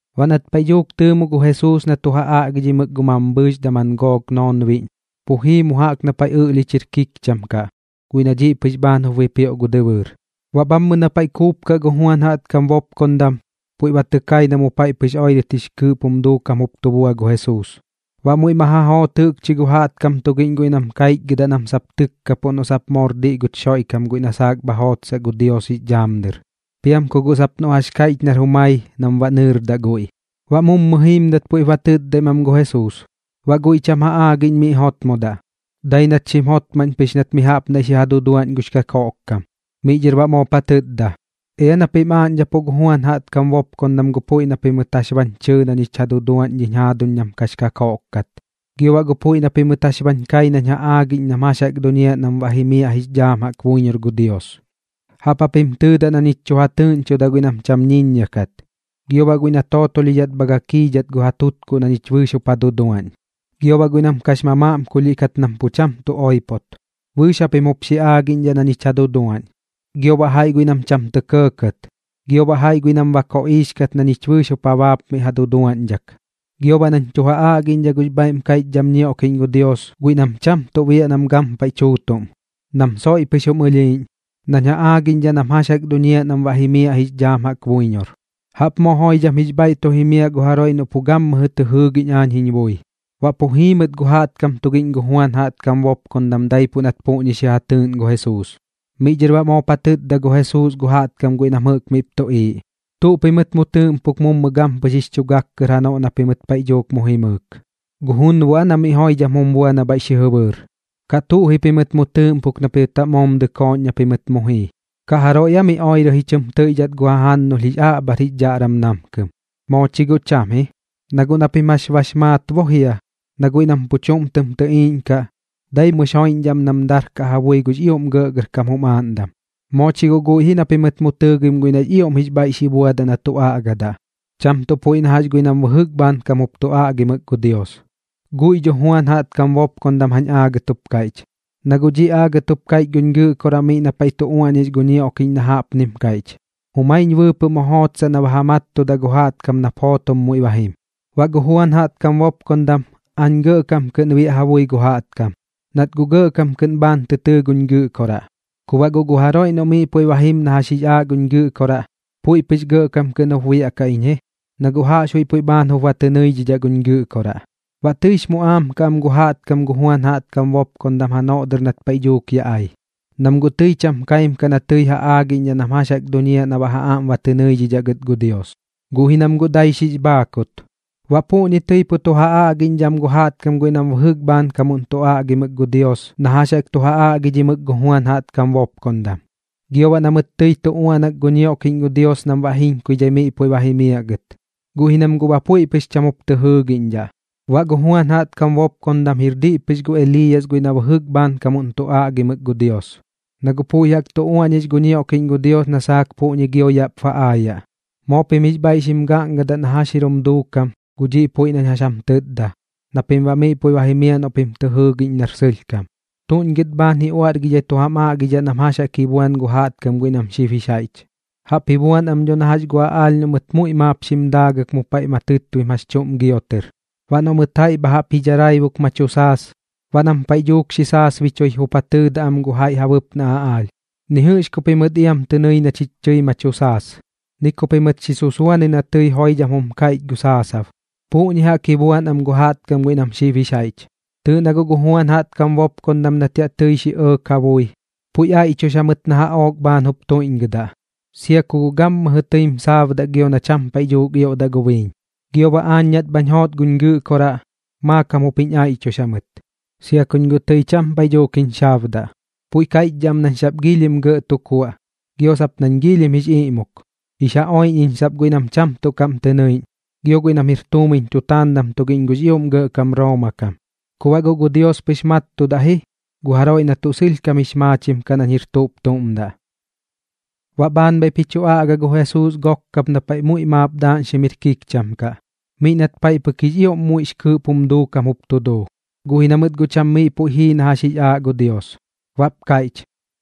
Baꞌ nat paiꞌ dhuuk tɨɨmo gu Jesuus na tu ja aꞌgidhimɨk gu mambhɨɨx daman gook noonbiꞌñ, pu jii mu jaꞌp na paiꞌ ɨꞌlhich jir kikcham kaꞌ guiꞌ na dhiꞌ pɨx bhaan jup bipioꞌ gu dɨbɨɨr. Baꞌ bhammɨ na paiꞌ kuupkaꞌ gu Juan jaꞌtkam bopkondam, puiꞌ ba tɨ kai na mu paiꞌ pɨx oirɨt jix kɨɨꞌp jum duukam jup tu bua gu Jesuus. Baꞌ muiꞌ ma ja joot jɨꞌkchi gu jaꞌtkam tugiꞌñ guiꞌ nam kaichgɨdaꞌ nam sap tɨtkapuꞌ noꞌ sap moor diꞌ guch Xoiꞌkam guiꞌ na saak bha jootsaꞌ gu Dios jix dhaam dɨr, piam ku guꞌ sap noꞌ jax kaiꞌch nar jumai nam baꞌ nɨɨradaꞌ guiꞌ. Baꞌ mummɨ jiimdat puiꞌp ba tɨtdaim am gu Jesuus. Baꞌ guiꞌ cham ja aagiꞌñ miꞌ jotmodaꞌ, dai nat xim jotmaꞌñ pɨx nat mi jaꞌp naiꞌ xi ja duduaꞌñ gux kakoꞌkkam. Miꞌ dhɨr baꞌ moop ja tɨtda: ―Ea na pim aaꞌñdhapuꞌ gu Juan jaꞌtkam bopkondam gu puiꞌ na pimɨt jax bañ chɨɨ na ñich ja duduaꞌñ dhiñ jaaduñ nam kax kakoꞌk kat, gio baꞌ puiꞌ na pimɨt jax bañ kai nañ ja aagiꞌñ nam jax jaꞌk duñiaꞌ nam baꞌ jimiaꞌ jix dhaam jaꞌk buiñor gu Dios. Jaꞌp japim tɨɨdaꞌ na ñich tu ja tɨɨꞌñchoda guiꞌ nam cham ñiññia kat, gio baꞌ guiꞌ na tootolhidhat ka gakiidhat gu ja tutkuꞌ na ñich bɨɨx jup ja duduaꞌñ. Gio baꞌ guiꞌ nam kax mamaꞌmkulhiꞌ kat nam pu cham tu oipot, bɨɨx japim jup xi aagiꞌñdhaꞌ na ñich ja duduaꞌñ, gio baꞌ jaiꞌ guiꞌ nam cham tɇ kɇɇkɇt. Gio baꞌ jaiꞌ guiꞌ nam ba koꞌiix kat na ñich bɨɨx jup ja baapmiꞌ ja duduaꞌñdhak. Gio baꞌ nañ tu ja aꞌgiꞌñdhaꞌ gux bhaiꞌm kaiꞌchdham ñioꞌkiꞌñ gu Dios guiꞌ nam cham tuꞌ biaꞌ nam gampaiꞌ tuꞌm, nam soiꞌ pɨx jum ɨlhiiꞌñ, nañ ja aagiꞌñdhaꞌ nam jax jaꞌk duñiaꞌ nam baꞌ jimiaꞌ jix dhaam jaꞌk buiñor. Jaꞌp moo joidham jix bhaiꞌ tu jimiaꞌ gu jaroiꞌ noꞌ pu gammɨjɨ tɨ jɨɨgiꞌñ aañ jiñ bui. Baꞌ pu jii mɨt gu jaꞌtkam tugiꞌñ gu Juan jaꞌtkam bopkondam daipuꞌ nat puꞌñi xi ja tɨɨꞌn gu Jesuus. Miꞌ dhɨr baꞌ moop ja tɨtda gu Jesuus gu jaꞌtkam guiꞌ nam jɨꞌk miꞌp tuꞌiiꞌ: ―¿Tuꞌ pimɨt mu tɨɨꞌmpuk mummɨ gampɨx jix chu gak kɨr janoꞌ na pimɨt paiꞌ dhuuk mu jimɨɨk? ¿Gu junboꞌ aa na miꞌ joidham jum bua na bhaiꞌ xi jɨbɨɨr? ¿Kaꞌ tuꞌ ji pimɨt mu tɨɨꞌmpuk na pimɨt baꞌ moom dɨkooꞌñ na pimɨt mu jii? ¿Kaꞌ jaroiꞌ aa mi oirɨ ji chɨm tɨiꞌdhat gu jajannulh jix aꞌbhar jix dhaꞌram namkɨm? Moo chi guꞌ cham ji, na guꞌ na pim jax bax maat bo jia na guiꞌ nam pu chuꞌm tɨm tɨꞌiiꞌñkaꞌ, dai mummɨx joiꞌñdhaꞌ am nam darkaꞌ ja bui gux ioꞌm gɇꞌgɇrkam jum aaꞌndam. Moo chi guꞌ guiꞌ ji na pimɨt mu tɨɨgim guiꞌ nax ioꞌm jix bhaiꞌ xi buadaꞌ na tu aꞌgadaꞌ, cham tuꞌ puiꞌ na jax guiꞌ nam bɨjɨk bhaankamuꞌn jup tu aꞌgimɨk gu Dios. Guiꞌ dho Juan jaꞌtkam bopkondam jañ aagat jup kaiꞌch, na guꞌ dhiꞌ aagat jup kaiꞌch guñ Gɨꞌkoraꞌ miꞌ na paiꞌ tu uaꞌñix gu ñioꞌkiꞌñ na jaꞌpnim kaiꞌch: Jumaiñ bɨɨpɨꞌ mu jootsaꞌ na baꞌ ba ja mattudaꞌ gu jaꞌtkam nap jootom muiꞌ ba jim. Baꞌ gu Juan jaꞌtkam bopkondam, aañ gɇꞌkam kɨꞌn biaꞌ ja bui gu jaꞌtkam, nat guꞌ gɇꞌkam kɨꞌn bhaan tɨ tɨɨ guñ Gɨꞌkoraꞌ. Ku baꞌ guꞌ gu jaroiꞌ noꞌ miꞌ puiꞌ ba jim na jax jix aaꞌ guñ Gɨꞌkoraꞌ, puiꞌ pɨx gɇꞌkam kɨꞌn jup biaꞌkaꞌ iñ ji, na guꞌ jaꞌxbuiꞌ puiꞌ bhaan jup ba tɨ nɨidhidhaꞌ guñ Gɨꞌkoraꞌ. ’Baꞌ tɨix muꞌaam kaꞌ am gu jaꞌtkam gu Juan jaꞌtkam bopkondam janoꞌ dɨr nat paiꞌ dhuuk ya ai, nam guꞌ tɨi cham kaim kaꞌ na tɨi ja aagiꞌñdhaꞌ nam jax jaꞌk duñiaꞌ na baꞌ ja aꞌm ba tɨ nɨidhidhaꞌ gɨt gu Dios, guꞌ ji nam guꞌ dai xix bhaakut. Baꞌ puꞌñi tɨi pu tu ja aꞌgiꞌñdhaꞌ am gu jaꞌtkam guiꞌ nam bɨjɨk bhaankam jup tu aꞌgimɨk gu Dios na jax jaꞌk tu ja aꞌgidhimɨk gu Juan jaꞌtkam bopkondam, gio baꞌ na mɨt tɨi tu uaꞌnak gu ñioꞌkiꞌñ gu Dios nam baꞌ jiñkuidhai miꞌ puiꞌ ba jimiaꞌ gɨt, guꞌ ji nam guꞌ ba puiꞌ pɨx cham jup tɨ jɨɨgiꞌñdhaꞌ. Baꞌ gu Juan jaꞌtkam bopkondam jir diꞌ pɨx gu Eliiyas guiꞌ na bɨjɨk bhaankamuꞌn tu aꞌgimɨk gu Dios, na guꞌ puiꞌ jaꞌk tu uaꞌñix gu ñioꞌkiꞌñ gu Dios na saak puꞌñi gio yaꞌp ba aayaꞌ. Moo pim jix bhaiꞌ xim gaꞌngadaꞌ na jax jir jum duukam gu dhiꞌ puiꞌ nañ jax jam tɨtda na pim baꞌ miꞌ puiꞌ jimiaꞌ noꞌ pim tɨ jɨɨgiꞌñ nar sɨlhkam. ’¿Tuꞌñ gɨt bhaan ji uaꞌrgidhai tu jam aagidhaꞌ nam jax jaꞌk ji buan gu jaꞌtkam guiꞌ nam xib jix jaiꞌch? Jaꞌp ji buan am dho na jax gu aꞌaalh noꞌ mɨt muiꞌ maap xim daagɨk mu paiꞌ ma tɨtbim jax chuꞌm giotɨr. Baꞌ noꞌ mɨt jaiꞌ bha jaꞌp ji dharaibuk ma tu saas, baꞌ nam paiꞌ dhuuk xi saasbichui jup ja tɨɨdaꞌ am gu jaiꞌ ja bɨpnaꞌ aꞌaalh: “Ni jɨꞌx ku pimɨt iam tɨ nɨi na chich tɨi ma tu saas, ni ku pimɨt xi susuanɨ na tɨi joiꞌmdam jum kaiꞌchɨt gu saasab.” Puꞌñi jaꞌk ji buan am gu jaꞌtkam guiꞌ nam xib jix jaiꞌch. Tɨɨꞌ na guꞌ gu Juan jaꞌtkam bopkondam nat tɨi yaꞌ xi ɇɇk ja bui, puiꞌ aiꞌchux jamɨt na jaꞌook bhaan jup tuiꞌñgɨdaꞌ, sia ku guꞌ gammɨjɨ tɨim saabdaꞌ gio na tɨi cham paiꞌ dhuuk ioꞌdaꞌ gu biiñ. Gio baꞌ aañ nat bhañ joot guñ Gɨꞌkoraꞌ, maakam jup jiñ aiꞌchux jamɨt, sia kuñ guꞌ tɨi cham paiꞌ dhuuk jiñ xaabdaꞌ. Puiꞌ kaiꞌchdhaꞌ am nañ sap giilhim gɇꞌ tu kuaꞌ gio sap nañ giilhim jix iꞌmuk, jix ja oiꞌñ iñ sap guiꞌ nam cham tuꞌ kaꞌm tɨ nɨiꞌñ gio guiꞌ nam jir tuumiñ tutaandam tugiꞌñ gux ioꞌm gɇꞌkam Rooma kam. Ku baꞌ guꞌ gu Dios pɨx mattudaꞌ ji gu jaroiꞌ na tuꞌ sɨlhkam jix maachim kaꞌ nañ jir tuꞌp tuꞌm daꞌ. Baꞌ bhaan bhaiꞌp ji chu aꞌga gu Jesuus gook kap na paiꞌ muiꞌ maap daaꞌñxim jir kikcham kaꞌ, miꞌ nat paiꞌ pɨk jix ioꞌm muiꞌx kɨɨꞌp jum duukam jup tu duu, guꞌ ji na mɨt guꞌ cham miꞌ puiꞌ jii na jax jix aaꞌ gu Dios. Baꞌp kaiꞌch: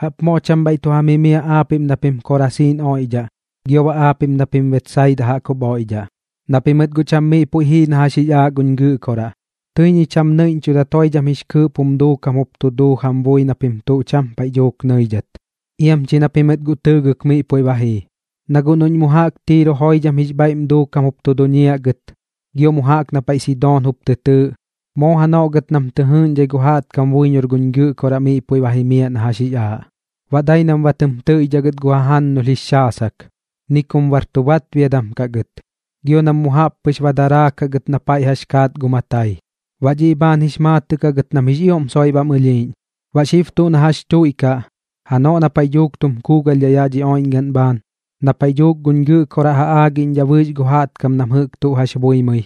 ―¡Jaꞌp moo cham bhaiꞌ tu jam jimiaꞌ aapiꞌm na pim Korasiiñ oiꞌdhaꞌ gio baꞌ aapiꞌm na pim Betsaida jaꞌk jup oiꞌdhaꞌ, na pimɨt guꞌ cham miꞌ puiꞌ jii na jax jix aaꞌ guñ Gɨꞌkoraꞌ! Tɨi ñich jam nɨiꞌñchudat joidham jix kɨɨꞌp jum duukam jup tu duu jam bui na pim tuꞌ cham paiꞌ dhuuk nɨidhat. Iam chi na pimɨt guꞌ tɨɨgɨk miꞌ puiꞌ ba jii. Na guꞌ noꞌñ mu jaꞌk Tiiro puiꞌ joidham jix bhaiꞌm duukam jup tu duñiaꞌ gɨt, gio mu jaꞌk na paiꞌ Sidoon jup tɨ tɨɨꞌ, moo janoꞌ gɨt nam tɨ jɨɨꞌñdhai gu jaꞌtkam buiñor guñ Gɨꞌkoraꞌ miꞌ puiꞌ ba jimiaꞌ na jax jix aaꞌ, baꞌ dai nam ba tɨm tɨiꞌdhaꞌ gɨt gu jajannulh jix xaasak, ni kum bar tu batbiadam kaꞌ gɨt, gio nam mu jaꞌp pɨx ba daraakaꞌ gɨt na paiꞌ jax kaat gu matai, baꞌ dhiꞌ bhaan jix maatɨꞌ kaꞌ gɨt nam jix ioꞌm soiꞌ bam ɨlhiiꞌñ. Baꞌ xib tuꞌ na jax chuiꞌkaꞌ, janoꞌ na paiꞌ dhuuk tum kuugalhdhaꞌ yaꞌ dhi oiꞌñgaꞌn bhaan, na paiꞌ dhuuk guñ Gɨꞌkoraꞌ ja aagiꞌñdhaꞌ bɨɨx gu jaꞌtkam nam jɨꞌk tuꞌ jax buimɨi,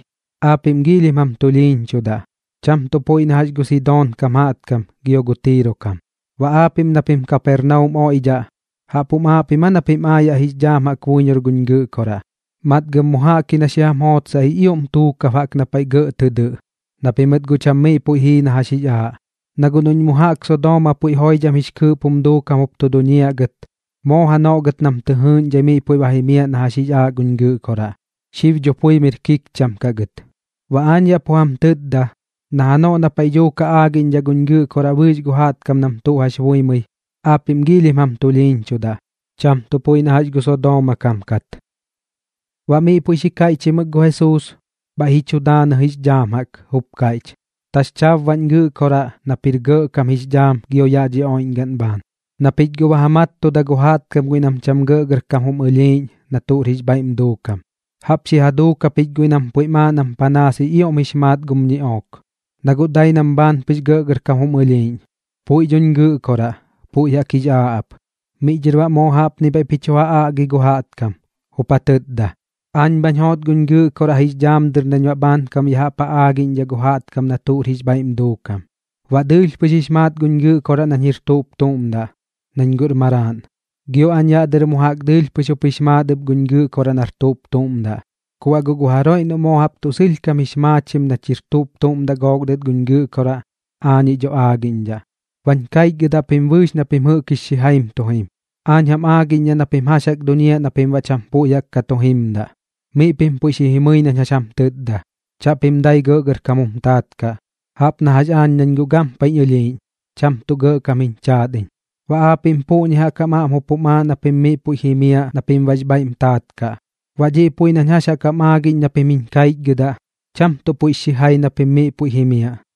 aapiꞌm giilhim jam tulhiiñchudaꞌ, cham tuꞌ puiꞌ na jax gu Sidoon kam jaꞌtkam gio gu Tiiro kam. Baꞌ aapiꞌm na pim Kapernaum oiꞌdhaꞌ, ¿jaꞌp jum aaꞌ pim aa na pim aayaꞌ jix dhaam jaꞌk buiñor guñ Gɨꞌkoraꞌ? Matgɨm mu jaꞌk ji na xi jam jootsaꞌ jix ioꞌm tuukab jaꞌk na paiꞌ gɇꞌ tɨ dɨꞌ, na pimɨt guꞌ cham miꞌ puiꞌ jii na jax jix aaꞌ. Na guꞌ noꞌñ mu jaꞌk Sodooma puiꞌ joidham jix kɨɨꞌp jum duukam jup tu duñiaꞌ gɨt, moo janoꞌ gɨt nam tɨ jɨɨꞌñdhai miꞌ puiꞌ jimiaꞌ na jax jix aaꞌ guñ Gɨꞌkoraꞌ, xib dho pui miꞌr kiicham kaꞌ gɨt. Baꞌ aañ yaꞌ pu jam tɨtda na janoꞌ na paiꞌ dhuuk ja aagiꞌñdhaꞌ guñ Gɨꞌkoraꞌ bɨɨx gu jaꞌtkam nam tuꞌ jax buimɨi, aapiꞌm giilhim jam tulhiiñchudaꞌ, cham tuꞌ puiꞌ na jax gu Sodooma kam kat. Baꞌ miꞌ puiꞌ xi kaiꞌchimɨk gu Jesuus, bhaiꞌ ji chu daanɨ jix dhaam jaꞌk, jup kaiꞌch: ―Taxchaab baꞌñ Gɨꞌkoraꞌ nap jir Gɇꞌkam jix dhaam gio yaꞌ dhi oiꞌñgaꞌn bhaan, na pich guꞌ ba ja mattuda gu jaꞌtkam guiꞌ nam cham gɇꞌgɇrkam jum ɨlhiiꞌñ na tuꞌr jix bhaiꞌm duukam. Jaꞌp xi ja duuk japich guiꞌ nam puiꞌm aaꞌ nam panaas jix ioꞌm jix maat gum ñiꞌook, na guꞌ dai nam bhaan pɨx gɇꞌgɇrkam jum ɨlhiiꞌñ. Puiꞌ dhoñ Gɨꞌkoraꞌ, puiꞌ jaꞌk jix aaꞌ ap. Miꞌ dhɨr baꞌ moo jaꞌpni bhaiꞌp ji chu ja aꞌgi gu jaꞌtkam, jup ja tɨtda: ―Aañ bhañ joot guñ Gɨꞌkoraꞌ jix dhaam dɨr nañ baꞌ bhaankam ya jaꞌp ja aagiꞌñdhaꞌ gu jaꞌtkam na tuꞌr jix bhaiꞌm duukam. Baꞌ dɨɨlh pɨx jix maat guñ Gɨꞌkoraꞌ nañ jir tuꞌp tuꞌm daꞌ, nañ guꞌr Maraaꞌn, gio aañ yaꞌ dɨr mu jaꞌk dɨɨlh pɨx jup jix maat ɨp guñ Gɨꞌkoraꞌ nar tuꞌp tuꞌm daꞌ. Ku baꞌ guꞌ gu jaroiꞌ noꞌ moo jaꞌp tuꞌ sɨlhkam kɨꞌn jix maachim nach jir tuꞌp tuꞌm daꞌ gook dɨt guñ Gɨꞌkoraꞌ, aañiꞌ dho aagiꞌñdhaꞌ. Bañ kaichgɨdaꞌ pim bɨɨx na pim jɨꞌk jix xijaim tu jim, aañ jam aagiꞌñdhaꞌ na pim jax jaꞌk duñiaꞌ na pim baꞌ cham puiꞌ jaꞌk ka tu jimdaꞌ. Miꞌ pim puiꞌ xi jimɨi nañ jax jam tɨtda, chaꞌpim dai gɇꞌgɇrkam jum taat kaꞌ, jaꞌp na jax aañ nañ guꞌ gampaiꞌñ ɨlhiiꞌñ, cham tuꞌ gɇꞌkam jiñ chaat iñ. Baꞌ aapiꞌm puꞌñi jaꞌk jam aꞌm jup jum aaꞌ na pim miꞌ puiꞌ jimiaꞌ na pim baꞌx bhaiꞌm taat kaꞌ. Baꞌ dhiꞌ puiꞌ nañ jax jaꞌk jam aagiꞌñ na pim jiñ kaichgɨdaꞌ, cham tuꞌ puiꞌx xijai na pim miꞌ puiꞌ jimiaꞌ.